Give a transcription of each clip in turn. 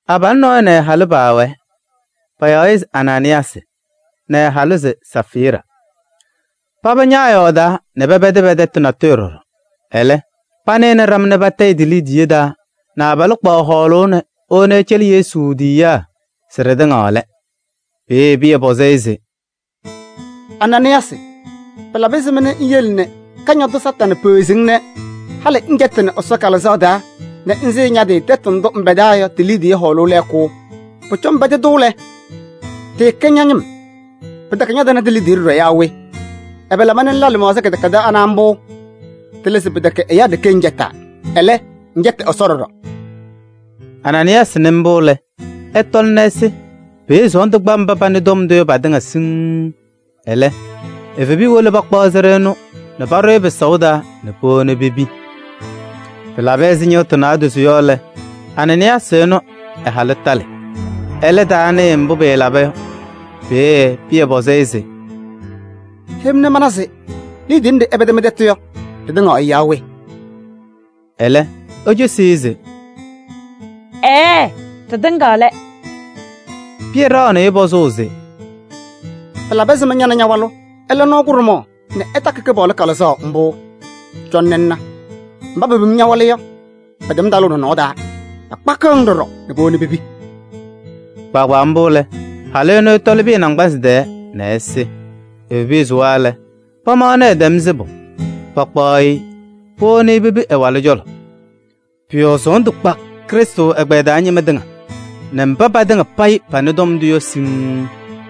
Abalʋ nɔɔyʋ nɛ ɛ-halʋ paawɛɛ, payaɣ-ɩ se Anaanɩyaasɩ nɛ ɛ-halʋ se Safɩɩra. Paba ñaayɔɔdaa nɛ pɛpɛdɩ pɛ-tɛtʋ natʋyʋ ɖɔɖɔ. Ɛlɛ, panɩnɩ ɖama nɛ patayɩ ti-liidiye taa nɛ abalʋ kpaɣ hɔɔlʋʋ nɛ ewoni ɛcɛlɩ Yesu tiyiyaa se ɖɩtɩŋa lɛ. Peeye Pɩyɛ pɔzɩ-ɩ se: “Anaanɩyaasɩ! Pɩlabɩ ɛzɩma nɛ ŋyele nɛ Kañadʋ Satanɩ peɣzi-ŋ nɛ halɩ ŋcɛtɩnɩ Ɛsɔ Kalɩzaɣ taa nɛ ŋsɩɩ ña-tɩ tɛtʋ ndʋ ŋpɛdaa yɔ ti-liidiye hɔɔlʋʋ lɛɛkʋ? Pʋcɔ ŋpɛdɩ-tʋ lɛ, tɩɩkɛ ña-ñɩm, pɩtɛkɛ ñatɩnɩ ti-liidiye ɖɔɖɔ yaa we? Ɛbɛ laba nɛ ŋla lɩmaɣza kɩdɛkɛdɛɛ anɛ mbʋ? Tɩlɩ se pɩtɛkɛ ɛyaa ɖeke ŋcɛtaa. Ɛlɛ, ŋcɛtɩ Ɛsɔ ɖɔɖɔ.” Anaanɩyaasɩ nɩ mbʋ lɛ, ɛtɔlɩ nɛ ɛsɩ. Peeye sɔɔndʋ kpa mba panɩ tɔm ndʋ yɔ patɩŋa siŋŋ. Ɛlɛ evebiya wolo pakpaɣ sɩɖʋ ɛnʋ nɛ paɖʋ-ɩ pɩsaʋ taa nɛ powoni-i pepi. Pɩlabɩ ɛzɩ ñɩɣtʋ naadozo yɔ lɛ, Anaanɩyaasɩ ɛnʋ ɛ-halʋ talɩ. Ɛlɛ, ɛtaanɩɩ mbʋ pɩlaba yɔ. Peeye Pɩyɛ pɔzɩ-ɩ se: “Heyi-m nɛ mana se liidiye nɖɩ ɩpɛdɩ mɩ-tɛtʋ yɔ, ɖɩtɩŋa yɔ yaa we?” Ɛlɛ ecosi se: “Ɛɛɛ, ɖɩtɩŋa lɛ.” Pɩyɛ ɖaɣnɩ-ɩ pɔzʋʋ se: “Pɩlabɩ ɛzɩma nɛ ña nɛ ña-walʋ ɩla nɔɔ kʋɖʋmaɣ nɛ ɩtakɩ Kɩpaɣlʋ Kalɩzaɣ mbʋ? Cɔnɩ ŋna! Mba pepim ña-walʋ yɔ, pɛtɛm talʋʋ nɔnɔɔ taa, pakpakɩɣ-ŋ ɖɔɖɔ nɛ powoni pepi.” Kpaagbaa mbʋ lɛ, halʋ ɛnʋ ɛtɔlɩ Pɩyɛ naŋgbanzɩ tɛɛ nɛ ɛsɩ. Evebiya sʋwa lɛ, pamaɣnɩ ɛtɛm sɩbʋ nɛ pakpaɣ-ɩ powoni pepi ɛ-walʋ cɔlɔ. Pʋ-yɔɔ sɔɔndʋ kpa Krɩstʋ ɛgbɛyɛ taa ñɩma tɩŋa nɛ mba patɩŋa payɩ panɩ tɔm ndʋ yɔ siŋŋ.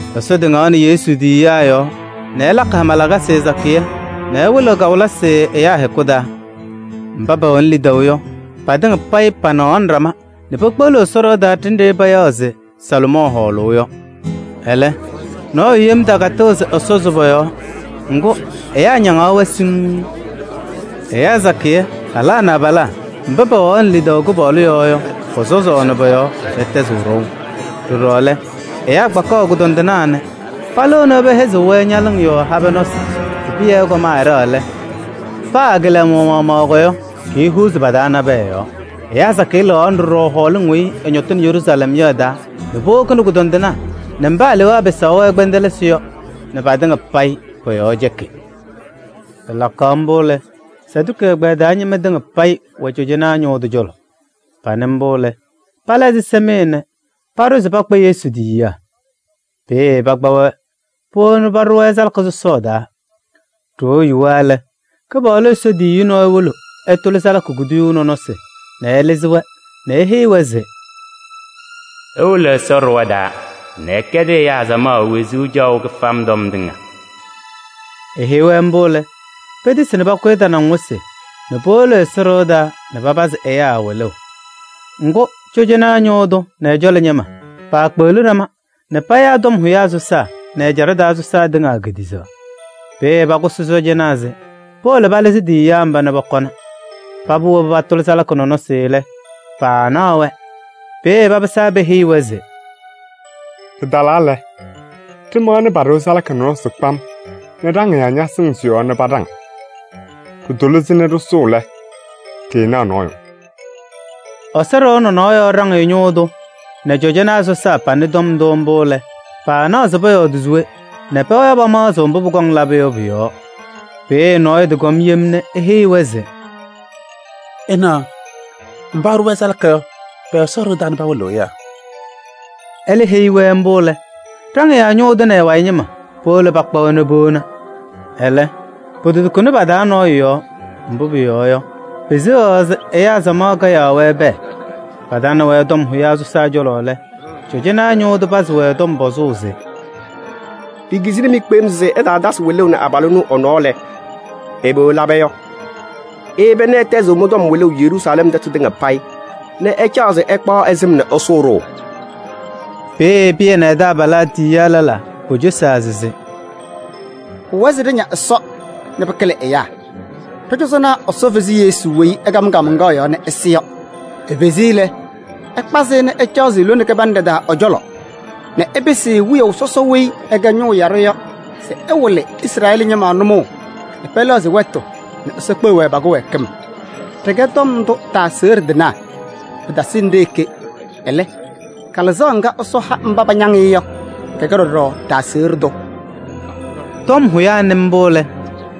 Ɛsɔ tɩŋaɣnɩ Yesu tiyiyaa yɔɔ nɛ ɛlakɩ hama lakasɩ sakɩyɛ nɛ ɛwɩlɩɣ kawɩlɩsɩ ɛyaa hɛkʋ taa. Mba pɛwɛnɩ lidaʋ yɔ, patɩŋa payɩ panɩɣaɣnɩ ɖama nɛ pekpeɣliɣ Ɛsɔ ɖɩɣa taa ɖenɖe payaɣ se Salomɔɔ Hɔɔlʋʋ yɔ. Ɛlɛ, nɔɔyʋ yem takatɩɣ se ɛsɔzɩ pɔ-yɔɔ. Ŋgʋ, ɛyaa ñayɩɣyaɣ-wɛ siŋŋ. Ɛyaa sakɩyɛ: halaa nɛ abalaa mba pɛwɛɣaɣnɩ lidaʋ Kɩpaɣlʋ yɔɔ yɔ, pɔsɔzaɣnɩ pɔ-yɔɔ nɛ pɛtɛzɩɣ ɖɔʋ. Ɖɔɖɔ lɛ, ɛyaa kpakaɣ kʋdɔndɩnaa nɛ palɩɣnɩ pɛhɛzɩɣ-wɛ ñalɩŋ yɔɔ habɛɛ nɔsɩ se Pɩyɛ ɛkɔm ɛɖɛɣ lɛ, paa ɛ-kɩlɛmʋʋ maɣmaɣ yɔ, kiihuuzi pa-taa nabɛyɛ yɔɔ. Ɛyaa sakɩyɛ lɩɣaɣnɩ ɖɔɖɔ hɔɔlɩŋ weyi ɩñɔtɩnɩ Yeruusalɛm yɔ ɩ-taa nɛ powokini kʋdɔndɩnaa nɛ mba alewaa pɩsaɣ-wɛ kpɛndɛlɩsɩ yɔ nɛ patɩŋa payɩ pɔ-yɔɔ cɛkɩ. Pɩlakaɣ mbʋ lɛ, Saduki ɛgbɛyɛ taa ñɩma tɩŋa payɩ wɛ cɔjɔnaa ñʋʋ tʋ cɔlɔ. Panɩ mbʋ lɛ, pala ɛzɩsɛmɩyɛ nɛ paɖʋ se pakpaɣ Yesu tiyiyaa. Peeye pakpa-wɛ powoni paɖʋ-wɛ salaka sɔsɔɔ taa. Ɖoo yuwa lɛ, Kɩpaɣlʋ Ɛsɔ tiyiyu nɔɔyʋ wolo ɛtʋlɩ salaka kuduyuu nɔnɔsɩ nɛ ɛlɩzɩ-wɛ nɛ eheyi-wɛ se: “Iwolo Ɛsɔ ɖɩɣa taa nɛ ɩkɛdɩ ɛyaa samaɣ wezuu caɣʋ kɩfam tɔm tɩŋa.” Eheyi-wɛ mbʋ lɛ, petisi nɛ pakʋyɩ tanaŋ wɩsɩ nɛ powolo Ɛsɔ ɖɩɣa taa nɛ papazɩ ɛyaa wɩlʋʋ. Ŋgʋ, cɔjɔnaa ñʋʋ tʋ nɛ ɛ-cɔlɔ ñɩma paakpeɣli ɖama nɛ payaa tɔm hʋyaa sɔsaa nɛ ɛjaɖɛ taa sɔsaa tɩŋa kediɣzaɣ. Peeye pakʋsɩ sɔɔjanaa se powolo palɩzɩ tiyiyaa mba nɛ pɔkɔna. Paba wobi patʋlɩ salaka nɔnɔsɩ lɛ, paanaɣ-wɛ. Peeye papɩsaa peheyi-wɛ se: “Ɖɩtalaa lɛ, ɖɩmaɣnɩ paɖɩɣ salaka nɔnɔsɩ kpam nɛ ɖaŋɩyaa ñasɩŋ sɩ-yɔɔ nɛ paɖaŋ. Ɖɩtʋlɩ-sɩ nɛ ɖɩsʋʋ lɛ, ɖɩɩnaɣ nɔɔyʋ.” Ɛsɔ ɖɩɣa nɔnɔɔ yɔɔ ɖaŋɩyaa ñʋʋ tʋ nɛ cɔjɔnaa sɔsaa panɩ tɔm ndʋ mbʋ lɛ, paanaɣ se pɔyɔɔdɩ se we nɛ pɛwɛɛ pamaɣzɩɣ mbʋ pʋkɔŋ labʋ yɔ pʋ-yɔɔ. Peeye nɔɔyʋ tɩkɔm yem nɛ eheyi-wɛ se: “Ɩnaɣ! Mba ɩɖʋ-wɛ salaka yɔ, pɛwɛ Ɛsɔ ɖɩɣa taa nɛ pawɩlɩɣ ɛyaa.” Ɛlɛ heyi-wɛ mbʋ lɛ, ɖaŋɩyaa ñʋʋ tʋ nɛ ɛ-wayɩ ñɩma powolo pakpa-wɛ nɛ powona. Ɛlɛ, pototukuni pa-taa nɔɔyʋ yɔɔ, mbʋ pʋyɔɔ yɔ, peseɣaɣ se ɛyaa samaɣ kayaɣ-wɛ pɛɛ. Patanɩ-wɛ tɔm hʋyaa sɔsaa cɔlɔ lɛ, cɔjɔnaa ñʋʋ tʋ pazɩ-wɛ tɔm pɔzʋʋ se: “Ɖikizini-mɩ kpem se ɩtaatasɩ wɩlʋʋ nɛ abalʋ ɛnʋ ɛ-nɔɔ lɛ, ɛbɛ ɩlaba yɔ? Iyeba nɛ ɩtɛzɩɣ mɩ-tɔm wɩlʋʋ Yeruusalɛm tɛtʋ tɩŋa payɩ nɛ ɩcaɣ se ɩkpaɣ ɛ-sɩm nɛ ɩsʋʋ-ɖʋ!” Peeye Pɩyɛ nɛ ɛ-taabalaa tiyiyaa lɛlaa pocosaa se: “Pʋwɛɛ se ɖɩña Ɛsɔ nɛ pɩkɩlɩ ɛyaa. Ɖɔ-cɔzɔnaa Ɛsɔ fezi Yesu weyi ɩkam kaamaŋkaɣ yɔɔ nɛ ɛsɩ yɔ. Efezi-i lɛ, ɛkpazɩ-ɩ nɛ ɛcaɣzɩ lone kɩbanɖɛ taa ɛ-cɔlɔ nɛ ɛpɩsɩ-ɩ Wiyaʋ Sɔsɔ weyi ɛkɛ Ñʋʋ Yaɖʋ yɔ se ɛwɩlɩ Izrɛɛlɩ ñɩma nʋmɔʋ nɛ pɛlɛɣzɩ wɛtʋ nɛ Ɛsɔ kpeɣ-wɛ pa-kɩwɛɛkɩm. Ɖɩkɛ tɔm ndʋ tɩ-aseɣɖe tɩnaa. Pɩtasɩnɩ ɖe-ɖeke, ɛlɛ, Kalɩzaɣ ŋga Ɛsɔ ha mba pañaŋ-ɩ yɔ, kɛkɛ tɩ-aseɣɖe tʋ ɖɔɖɔ.” Tɔm hʋyaa nɩ mbʋ lɛ,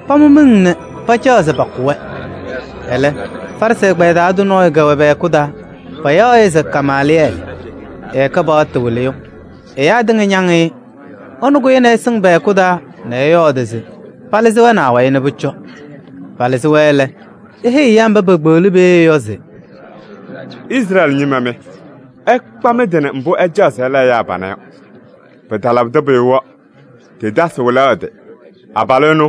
pamʋ miŋ nɛ pacaɣ se pakʋ-wɛ. Ɛlɛ, Farɩsɩ ɛgbɛyɛ taa tʋ nɔɔyʋ kɛwɛ pɛ-hɛkʋ taa, payaɣ-ɩ se Gamaalɩyɛɛlɩ. Ɛkɛ paɣtʋ wɩlɩyʋ, ɛyaa tɩŋa ñaŋ-ɩ. Ɛnʋ kʋyɩnɩ ɛsɩŋ pɛ-hɛkʋ taa nɛ ɛyɔɔdɩ se palɩzɩ-wɛ nɛ awayɩ nɛ pʋcɔ. Palɩzɩ-wɛ lɛ, eheyi ɛyaa mba paakpeɣli peeye yɔ se: “Izrɛɛlɩ ñɩma mɩ! Ɩkpa mɩ-tɩ nɛ mbʋ ɩcaɣ se ɩla ɛyaa panɛ yɔ. Pɩtalabɩdɩ pʋyʋ yɔ, Teedaasɩ wɩlaɣ ɛ-tɩ. Abalʋ ɛnʋ,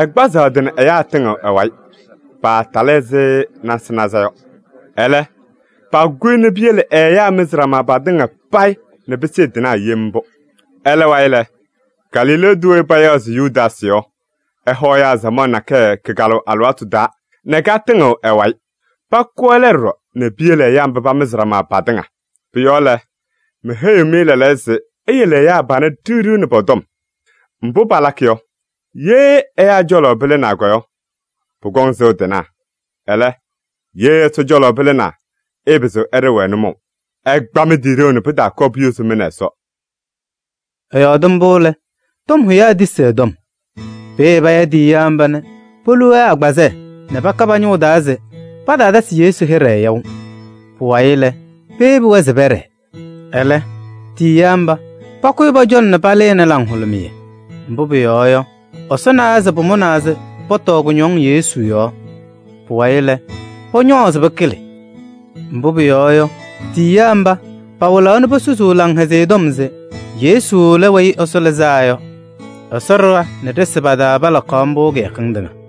ɛkpazaɣ ɛ-tɩ nɛ ɛyaa tɩŋɩɣ ɛ-wayɩ, paatalɩ ɛzɩ nasɩnaza yɔ. Ɛlɛ, pakʋ-ɩ nɛ piyele ɛ-ɛyaa mɩzɩ ɖama patɩŋa payɩ nɛ pɩsɩɩ tɩnaɣ yem mbʋ. Ɛlɛ wayɩ lɛ, Galilee tʋ weyi payaɣ se Yudaasɩ yɔ, ɛhɔ ɛyaa samaɣ nakɛyɛ kɩkalʋʋ alɩwaatʋ taa nɛ katɩŋɩɣ ɛ-wayɩ. Pakʋ ɛlɛ ɖɔɖɔ nɛ piyele ɛyaa mba pamɩzɩ ɖama patɩŋa. Pʋ-yɔɔ lɛ, meheyiɣ-mɩ lɛɛlɛɛyɔ se: iyele ɛyaa panɛ ɖiɣ ɖiɣ nɛ pɔ-tɔm. Mbʋ palakɩ yɔ, ye ɛyaa cɔlɔ pɩlɩnaa yɔ, pʋkɔŋ sɩʋ tɩnaɣ. Ɛlɛ, ye Ɛsɔ cɔlɔ pɩlɩnaa yɔ, ɩɩpɩzɩɣ ɩɖɩɣ-wɛ nʋmɔʋ. Ɩkpa mɩ-tɩ ɖeu nɛ pɩtaakɔɔ puyozi mɩ nɛ Ɛsɔ!” Ɛyɔɔdɩ mbʋ lɛ, tɔm hʋyaa tisi ɛ-tɔm. Peeye paya tiyiyaa mba nɛ polu-wɛ agbazɛɛ nɛ paka pa-ñʋŋ taa se pataatasɩ Yesu hɩɖɛ yaʋ. Pʋwayɩ lɛ, peyebi-wɛ se pɛɖɛɛ. Ɛlɛ, tiyiyaa mba pakʋyɩ pɔ-cɔlɔ nɛ palɩnɩ laŋhʋlʋmɩyɛ. Mbʋ pʋyɔɔ yɔ, Ɛsɔ nawa se pamʋnaa se pɔtɔɔ kʋñɔŋ Yesu yɔɔ. Pʋwayɩ lɛ, pʋñɔɔzɩ pɩkɩlɩ. Mbʋ pʋyɔɔ yɔ, tiyiyaa mba pawɩlaɣ nɛ posusuu Laŋhɛzɩyɛ Tɔm se Yesu lɛ Weyi Ɛsɔ Lɩzaa Yɔ. Ɛsɔ ɖɩɣa nɛ ɖɩsɩ pa-taa palakaɣ mbʋ kɩyakɩŋ tɩŋa.